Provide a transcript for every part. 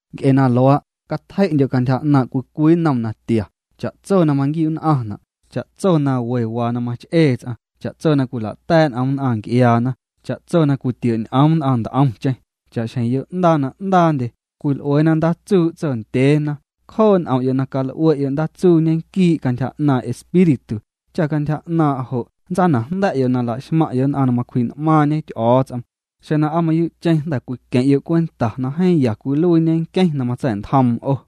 Nc'e na luaa', catjei'ndyo' cantyja 'naaⁿ' cwii cwii nnom natia, cha'tso na maquiu'nn'aⁿna', cha'tso na we waa na mach'ee ts'aⁿ, cha'tso na cwila'ta̱a̱' n'om nn'aⁿ nc'iaana, cha'tso na cwitio'ñ'oom nn'aⁿ nt'omcheⁿ. Cha'xjeⁿ yo'ndaa na 'ndaandye cwil'ueena ndaatsuu' tsondyeena, cjoo' n'om'yo' na cal'ue'yo' ndaatsuu ñequii' cantyja 'naaⁿ' Espíritu, cha cantyja 'naaⁿ' jo' nntsanajnda̱'yo' na laxmaⁿ'yo' nn'aⁿ na macwji'n'maaⁿñe Ty'o̱o̱ts'om, xeⁿ na aa mayuu'cheⁿ jnda̱ cwiqueⁿ'yo' cwenta na jeeⁿ ya cwiluiiñe nqueⁿ na matsa̱'ntjoom 'o.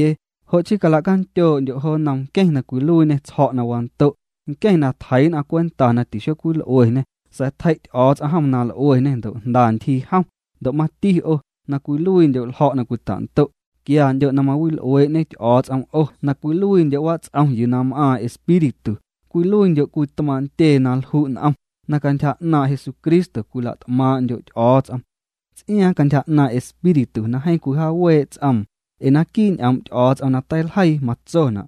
Jo' chii cala'candyoo'ndyo' jo nnom nqueⁿ na cwiluiiñê tsjo̱' na wando', nqueⁿ na tjeii' nn'aⁿ cwenta na xocwil'ueñê, sa̱a̱ tjei' Ty'o̱o̱ts'om jom na l'ueñê ndo' jnda ntyjii jom. Ndo' mati 'o, na cwiluiindyo' ljo̱' na cwita'ndo', quiandyo' na mawil'uee'ñe Ty'o̱o̱ts'om 'o na cwiluiindyo' wats'om yuu na m'aaⁿ Espíritu, cwiluiindyo' cwii tmaaⁿ' ntyee na lju' n'om, na cantyja 'naaⁿ' Jesucristo cwila't'maaⁿ'ndyo' Ty'o̱o̱ts'om, ts'iaaⁿ cantyja 'naaⁿ' Espíritu na jeeⁿ cwijaawee' ts'oom. Ee naquii' ñ'oom' Ty'o̱o̱ts'om na teiljeii matsona':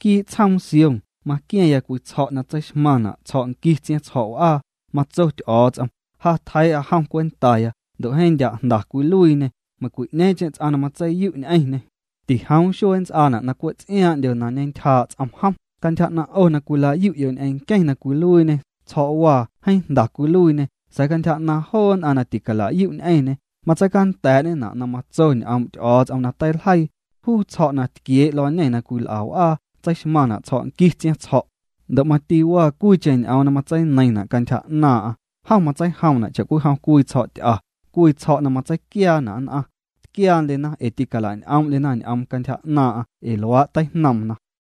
Quii' tsjoom Sión maqua̱ⁿya cwii tsjo̱' na tseixmaⁿna' tsjo̱' nquii tsiaⁿtsjo̱' w'aa. Matso Ty'o̱o̱ts'om: Ja tjeii'a jom cwentaya ndo' jeeⁿ ndya' jnda cwiluiiñê; Meiⁿ'ñeeⁿcheⁿ ts'aⁿ na matseiyu' ñ'eⁿñê, tijoom xuee nnts'aana' na cwe' ts'iaaⁿ'ndyo na ñentyjaa' ts'om jom. Cantyja 'naⁿ' 'o na cwila'yu'yo' ñ'eⁿ nqueⁿ na cwiluiiñê tsjo̱'waa, jeeⁿ jnda cwiluiiñê sa̱a̱ cantyja 'naaⁿ joo nn'aⁿ na ticalayu' ñ'eⁿñê, matseicanda̱a̱'ñena' na matso ñ'oom' Ty'o̱o̱ts'om na teiljeii: Juu tsjo̱' na tquiee' luañê na cwil'a w'aa, tseixmaⁿna' tsjo̱' nqui tsiaⁿtsjo̱'. Ndo' mati waa cwiicheⁿ ñ'oom na matseineiⁿna' cantyja 'naaⁿ'aⁿ: Jom matseijomna' cha'cwijom cwii tsjo̱' ty'a, cwii tsjo̱' na matseiquiaana' nn'aⁿ. Tquiaandyena ee tilañ'oom'ndyena ñ'oom cantyja naaⁿ'aⁿ ee luaa' teijnoomna.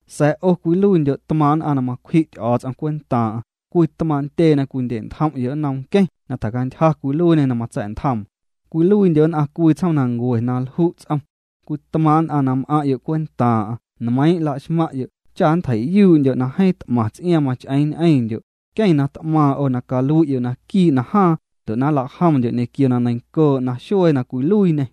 Sa̱a̱ 'o cwiluiindyo' tmaaⁿ nn'aⁿ na macwji' Ty'o̱o̱ts'om cwentaaⁿ'aⁿ, cwii tmaaⁿ' ntyee na cwindye'ntjom'yo' nnom nqueⁿ na tjacantyja cwiluiiñê na matsa̱'ntjoom, cwiluiindyo' nn'aⁿ cwii tsjoomnancue na lju' ts'om, cwii tmaaⁿ' nn'aⁿ na m'aⁿ'yo' cwentaaⁿ'aⁿ, nmeiiⁿ' laxmaⁿ'yo' cha nntjei'yuu'ndyo' na jeeⁿ t'maⁿ ts'iaaⁿ mach'eeⁿ ñ'eⁿndyo', nqueⁿ na t'maaⁿ 'o na calui'yo' naquii' najaaⁿ ndo' na nlajomndyo' ñequio na neiⁿncoo' naxuee na cwiluiiñê.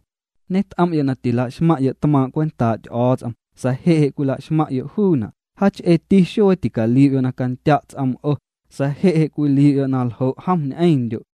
Ñet'om'yo' na tîlaxmaⁿ'yo' tmaaⁿ' cwentaa' Ty'o̱o̱ts'om, sa̱a̱ je' je' cwila'xmaⁿ'yo' juuna'. Jaach'eeti xuee tîcaliu'yo' na candya' ts'oom 'o, sa̱a̱ je' je' cwiliu'yo' na ljo' jom ñ'eⁿndyo'.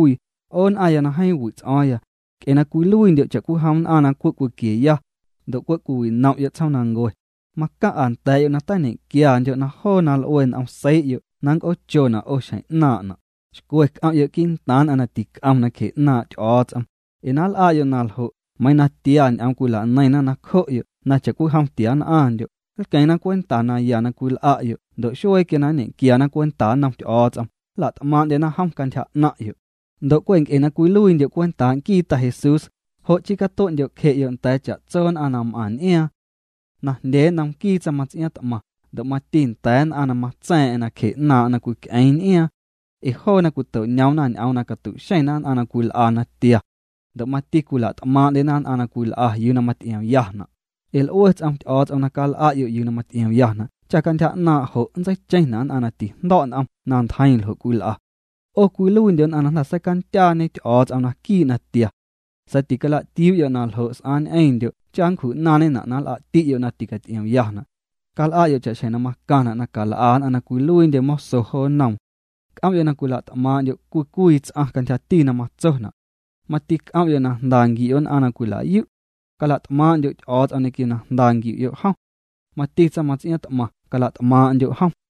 'O nn'aⁿya na jeeⁿ wi' ts'o̱o̱ⁿya, nc'e na cwiluiindyo' cha'cwijom nn'aⁿ na cwe' cwiquieya, ndo' cwe' cwiwinom'yo' tsjoomnancue, macaⁿ'a nda̱a̱'yo' na tañequiandyo' na joo na l'ue n'om seii'yo' na nnc'oochona' 'o xjeⁿ 'naaⁿna'. Xcwe c'om'yo' quii'ntaaⁿ nn'aⁿ na tic'om nacje 'naaⁿ' Ty'o̱o̱ts'om, ee na nl'a'yo' na ljo' meiiⁿ na tia ñ'oom cwilaneiⁿna nacjo'yo' na cha'cwijom tiann'aⁿndyo', nlqueⁿna cwenta naya na cwil'a'yo' ndo' xuee quia na nñequiana cwenta nnom Ty'o̱o̱ts'om, nla't'maaⁿ'ndyena jom cantyja 'naⁿ'yo'. Ndo' cwe' nc'e na cwiluiindyo' cwentaa' nquii Ta Jesús, jo' chii catue'ndyo'cje'yo' nda̱a̱ cha'tso nn'aⁿ na m'aⁿ n'iaaⁿ. Najndyee nnom nquii tsaⁿmaⁿts'iaaⁿt'maⁿ, ndo' mati nda̱a̱ nn'aⁿ na matsa̱a̱ⁿ'a̱ⁿ nacje 'naaⁿ'aⁿ na cwic'eeⁿ n'iaaⁿ. Ee joona cwito'ñoomna ñ'oom na catu'xeⁿna nn'aⁿ na cwil'a natia. Ndo' mati cwila't'maaⁿ'ndyena nn'aⁿ na cwil'a yuu na maty'iomyana'. Ee l'ue ts'om Ty'o̱o̱ts'om na cal'a'yo' yuu na maty'iomyana' cha cantyja 'naaⁿ' jo' nntseicheⁿna' nn'aⁿ na tijndo̱' n'om na ntjeiⁿ ljo' cwil'a. 'O cwiluiindyo' nn'aⁿ na jnda̱ seicandyaañe Ty'o̱o̱ts'om naquii' natia. Sa̱a̱ ticala'tiuu'yo' na ljo' s'aaⁿ ñ'eⁿndyo' cha nncju'naaⁿñena' na nl'a'ti'yo' na ticaty'iomyana'. Cal'a'yo' cha'xjeⁿ na macaⁿna' na cal'a nn'aⁿ na cwiluiindye moso jo nnoom. C'om'yo' na cwila't'maaⁿ'ndyo' cwii cwii ts'aⁿ cantyjati na matsona'. Mati c'om'yo' na jnda nquiu'yo' nn'aⁿ na cwila'yu'. Cala't'maaⁿ'ndyo' Ty'o̱o̱ts'om ñequio na jnda nquiu'yo' jom. Mati tsaⁿmaⁿts'iaaⁿ t'maⁿ, cala't'maaⁿ'ndyo' jom.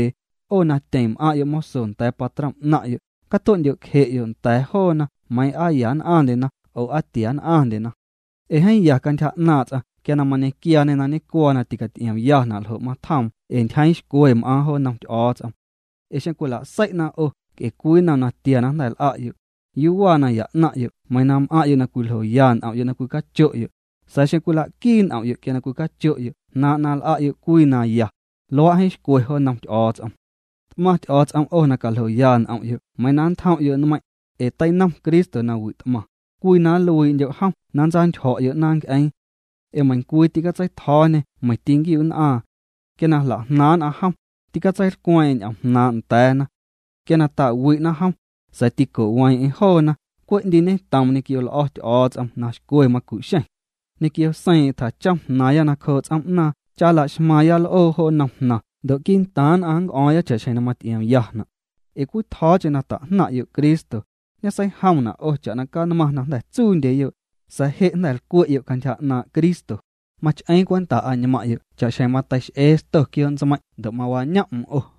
'O na tyeⁿ m'aⁿ'yo' moso nda̱a̱ patrom 'naⁿ'yo', catue'ndyo'cje'yo' nda̱a̱ joona meiiⁿ aa ya nn'aⁿndyena oo aa tiann'aⁿndyena. Ee jeeⁿ ya cantyja 'naaⁿ' ts'aⁿ quia mañequiaañe na ñecuaa na ticaty'iomyana' ljo' matjoom ee ntyjeeⁿ xcwe m'aaⁿ jo nnom Ty'o̱o̱ts'om. Ee xeⁿ cwila'sei'na 'o nc'e cwii nnom na tia na jnda̱ l'a'yo', ¿yuu waa naya 'naⁿ'yo' meiiⁿ na m'aⁿ'yo' na cwiljoya n'om'yo' na cwicacho'yo'? Sa̱a̱ xeⁿ cwila'quii n'om'yo' quia na cwicacho'yo' jnaaⁿ' na l'a'yo' yuu na ya, luaa' jeeⁿ xcwe jo nnom Ty'o̱o̱ts'om. T'maⁿ Ty'o̱o̱ts'om 'o na caljoya n'om'yo' meiiⁿ na nntjom'yo' nmeiⁿ', ee teinom Cristo na wi't'maⁿ, cwii na nluii'ndyo' jom na ntsantyjo̱'yo' 'naaⁿ nc'eeⁿ. Ee meiⁿcwii tîcatseitjo̱o̱ñê meiⁿ tîquinquiu'nn'aaⁿ. Quia na jla'jnaaⁿ' nn'aⁿ jom, tîtseilcweeⁿ'eⁿ ñ'oom jnaaⁿ' nda̱a̱na. Quia na ta'wi'na jom, sa̱a̱ tîco'weeⁿ'eⁿ joona, cwe' 'ndiiñetoom ñequio l'o̱ Ty'o̱o̱ts'om na xcwe macu'xeⁿ. Ñequio seiiⁿ'eⁿ tjachom jnaaⁿya nacjoo' ts'oom'naaⁿ cha nla'xmaaⁿya l'oo jo nnom jnaⁿ ndo' quii'ntaaⁿ nn'aⁿ nc'o̱o̱ⁿya cha'xjeⁿ na maty'iomyana'. Ee cwitjo̱o̱cheⁿ na tajnaⁿ'yo' Cristo, ñeseijomna' 'o cha'na canmaⁿ na jnda̱ tsuundyeyoo', sa̱a̱ je' na jnda̱ lcwe'yo' cantyja 'naaⁿ' Cristo, mach'eeⁿ cwenta añmaaⁿ'yo' cha'xjeⁿ mateix'ee sto quioo'ñeeⁿ ndo' na mawañoom'm 'o.